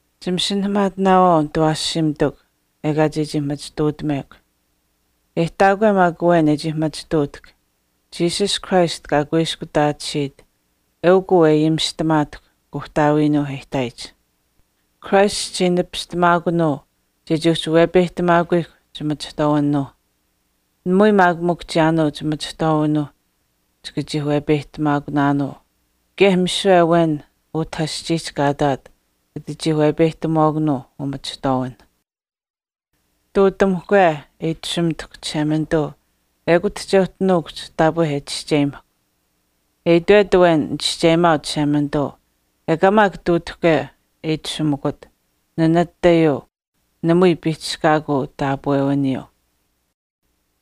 Chimasinahamaatinaawaau nitawaashiimitikw ekaa chechii machituutamekw. E ihtaakwe maak awen e chii machituutahk Jesus Christ kaa kuiskutaatisiit eukw uu e ayimishtamaatahkw Kuuhtaawiinuuh e ihtaayich. Christ chichii nipistamaakunuu chechii uhchi wepeyihtamaakuyihkw chimachihtwaawinuuh. Namui maak mikw chiyaanuu chimachihtwaawinuuh chika chii wepeyihtamaakunaanuu kaye misiwe awen utah aschiihch kaa ihtaat kata chii wepeyihtamuwaakanuu umachihtwaawinh. Ihtuutamuhkwe e itashumitahkw Chishemanituu ekut che uhchi nuukuhch taapwe e chischeyimahkw. E itwet awen nichischeyimaau Chishemanituu ekaa maak ihtuutahke e itashumikut, nanatayuu, namui piihchishkaakuu taapwewiniyuu.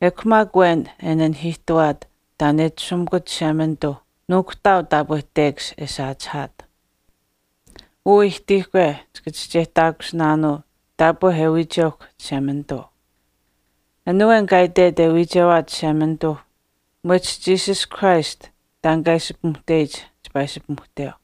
Ekw maak awen e nanihiihtawaat taan e itashumikut Chishemanituuh nuukuhtaau taapwe tekash e saachihaat. Uu ihtiihkwe chika chischeyihtaakusinaanuu taapwe e wiicheuhkw Chishemanituu. An awen kaa itwet e wiichewaat Chishemanituuh mwehch Jesus Christ taan kaa ishi pimuhteyich chipaa ishi pimuhteu.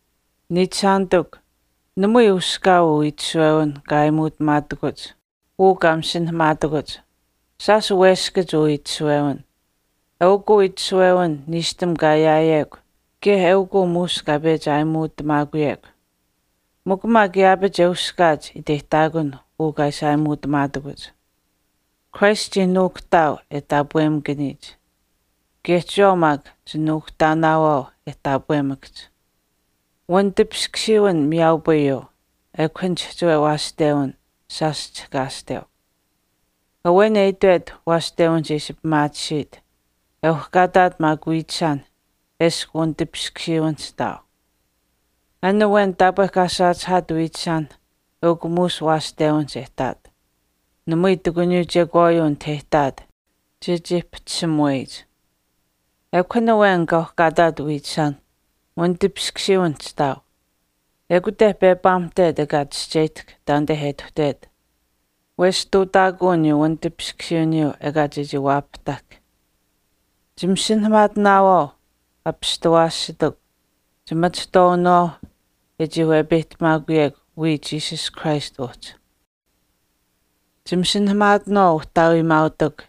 Niichishaanitikw, namui uskaau uu itishawewin kaa aayimuutamaatakuch uu kaa masinahamaatakuch. Shaash weskach uu itishawewin. Eukw uu itishawewin niishtam kaa ayaayekw kaye eukuu muush kaa pechi aayimuutamaakuyekw. Mikw maak yaapach e uskaach iteyihtaakun uu kaa ishi aayimuutamaatakuch. Christ chii nuukuhtaau e taapwemakaniyich. Kaye chiyawaau maak chinuukuhtaanaawaau e taapwemakahch. Wanitipiskusiiwin miyaaupayuu, ekw an chihchiwe waashtewin shaash chihkaashteu. Awen e itwet waashtewinihch e ishi pimaatisiit, e uhkaataat maak wiichishaan eshkw wanitipiskusiiwinihch ihtaau. An awen taapwe kaa saachihaat wiichishaan eukw muush waashtewinihch e ihtaat. Namui ihtakuniyuu chekwaayuu anit e ihtaat chechii pahchishimuweyich. Ekw an awen kaa uhkaataat wiichishaan, wanitipiskusiiwinihch ihtaau. ekute pepaamuhtet ekaa chischeyihtahk taanite e ituhtet wesh ihtuutaakuu aniyuu wanitipiskusiiwiniyuu ekaa chechii waapahtahk. Chimasinahamaatinaawaau, apishtawaashitikw, chimachihtwaawinawaau e chii wepeyihtamaakuyekw wiya Jesus Christ uhchi. Chimasinahamaatinaawaau uhtaawiimaautikw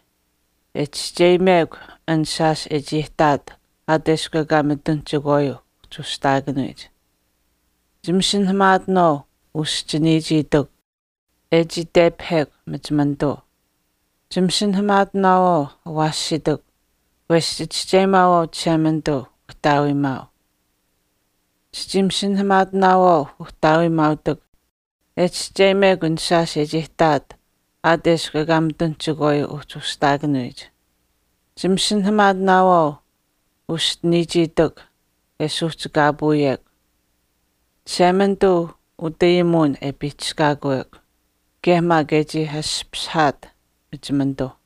e chischeyimekw an shaash e chii ihtaat aat eshkw ekaa mitun chekwaayuu uhchi ushihtaakanuyich. Chimasinahamaatinaawaau, uschiniichiitikw, e chii tepahekw machimanituu. Chimasinahamaatinaawaau, awaashitikw, wesh chichischeyimaawaau Chishemanituu uhtaawiimaau. Chichii masinahamaatinaawaau, Uhtaawiimaautikw, e chischeyimekw an shaash e chii ihtaat aat eshkw ekaa mitun chekwaayuu uhchi ushihtaakanuyich. Chimasinahamaatinaawaau uschiniichiitikw wesh chisuuhchikaapuunaawaau, Chishemanituu utayimuwin e piihchishkaakuyekw, kaye maak e chii ashpashihekw machimanituu.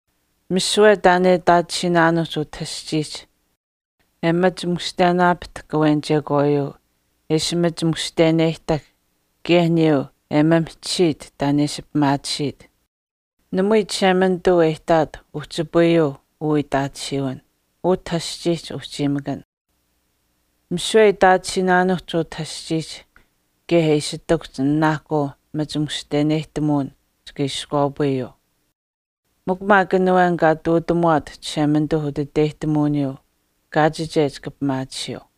Misiwe taan e itaatisiinaanuuhch utah aschiihch, e machi mushtenaapahtahk awen chekwaayuu, e ishi machi mushteneyihtahk, kaye aniyuu e maamihchisiit taan e ishi pimaatisiit, namui Chishemanituu e ihtaat uhchipayuu uu itaatisiiwin, utah aschiihch uhchiimakan. Misiwe e itaatisiinaanuuhch utah aschiihch kaye e ishi ihtakuhch nanaahkuu machi mushteneyihtamuwin chika iskwaapayuu. Mikw maak an awen kaa ihtuutamuwaat Chishemanituu utiteyihtamuwiniyuu kaachiche chika pimaatisiyuu.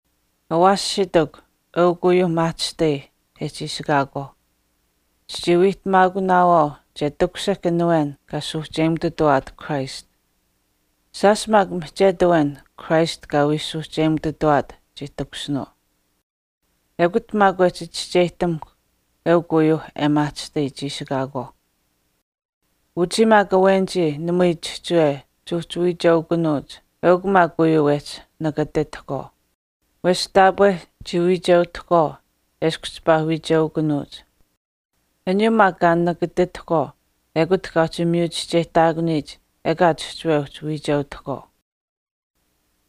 Awaashitikw, eukw uyuuh maahchishtai e chiishikaakwaauh. Chichii wiihtamaakunaawaau che takushihk an awen kaa suuhcheyimututawaat Christ. Shaash maak mihchetu awen Christ kaa wii suuhcheyimututawaat chii takushinuu. Ekut maak wehchi chischeyihtamuhkw eukw uyuuh e maahchishtai chiishikaakwaauh. Uchii maak awenichii namui chihchiwe chuuhchi wiicheukunuuch eukw maak uyuu wehchii nakatitahkwaau. Wesh taapwe chii wiicheutahkwaau eshkw chipaa wiicheukunuuch. Aniyuu maak kaa nakatitahkwaau ekut kaa uhchi miyu chischeyihtaakuniyich ekaa chihchiwe uhchi wiicheutahkwaau.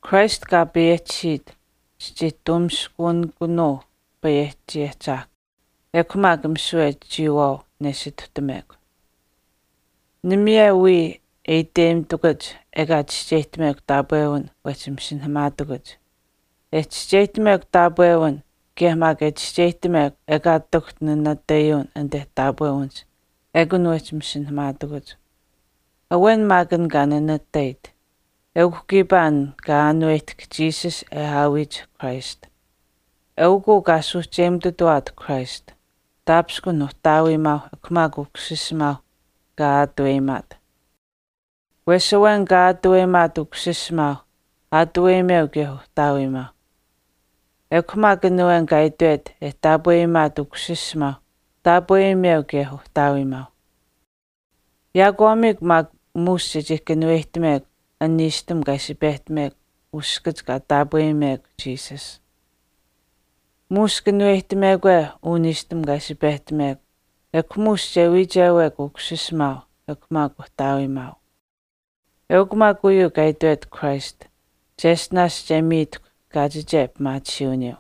Christ kaa payehchisiit, chichii tuumiskunikunuu Payehchi Ahchaahkwa, ekw maak misiwe chiyawaau nesituhtamekw. Namui wii e iteyimitakuch ekaa chischeyihtamekw taapwewin wehch masinahamaatakuch. E chischeyihtamekw taapwewin kaye maak e chischeyihtamekw ekaa ihtakuhch nanatayuwin anite taapwewinihch ekun wehchi masinahamaatakuch. Awen maak an kaa nanatait. Eukw kiipaa an kaa aanuwehtahk Jesus e aawiyich Christ. Eukuu kaa suuhcheyimututawaat Christ, taapishkun Uhtaawiimaau ekw maak Ukusisimaau kaa aataweyimaat. Wesh awen kaa aatuweyimaat Ukusiisimaau aatuweyimeu kaye Uhtaawimaau. Ekw maak an awen kaa itwet e taapweyimaat Ukusisimaau taapweyimeu kaye Uhtaawiimaauh. Yaakwaamiikw maak muush chechii kanuweyihtamekw an niishtam kaa ishi pehtamekw uskach kaa taapweyimekw Jesus. Muush kanuweyihtamekwe uu niishtam kaa ishi pehtamekw muush chika wiichewaawaau Ukusisimaau kaye Uhtaawiimaau. Eukw maak uyuu kaa itwet Christ, cheshtinaash che miitahkw kaachiche pimaatisiiwiniyuu.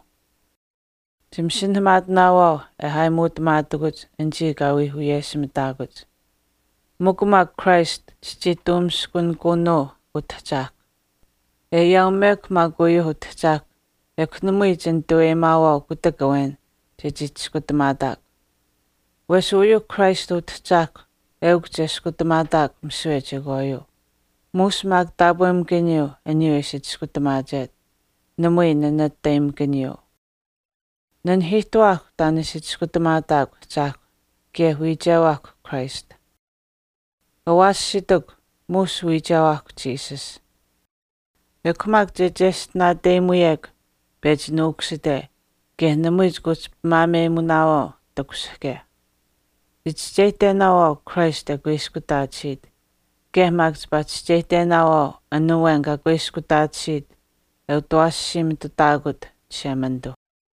Chimasinahamaatinaawaau e aayimuutamaatakuch anichii kaa wii wiyeshimitaakuch. Mikw maak Christ chichii tuumiskunikunuu Utahchaahkwa. E ayaaumekw maak uyuu Utahchaahkwa namui chinitaweyimaawaau kutak awen chechii chiskutamaataakw. Wesh uyuuh Christ Utahchaahkwa eukw che chiskutamaataakw misiwe chekwaayuu, muush maak taapwemakaniyuu aniyuu e ishi chiskutamaachet, namui nanatayimakaniyuu. Nanihiihtuwaahkw taan e ishi chiskutamaataakw Ahchaahkw kaye wiichewaahk Christ. Awaashitikw, muush wiichewaahkw Jesus. Ekw maak che cheshtinaateyimuyekw pechi nuukusite kaye namui chika uhchi pimaameyimunaawaau takushihke. Chichischeyihtenaawaau Christ e kuiskutaatisiit, kaye maak chipaa chischeyihtenaawaau an awen kaa kuiskutaatisiit e utawaashiimitutaakut Chishemanituu.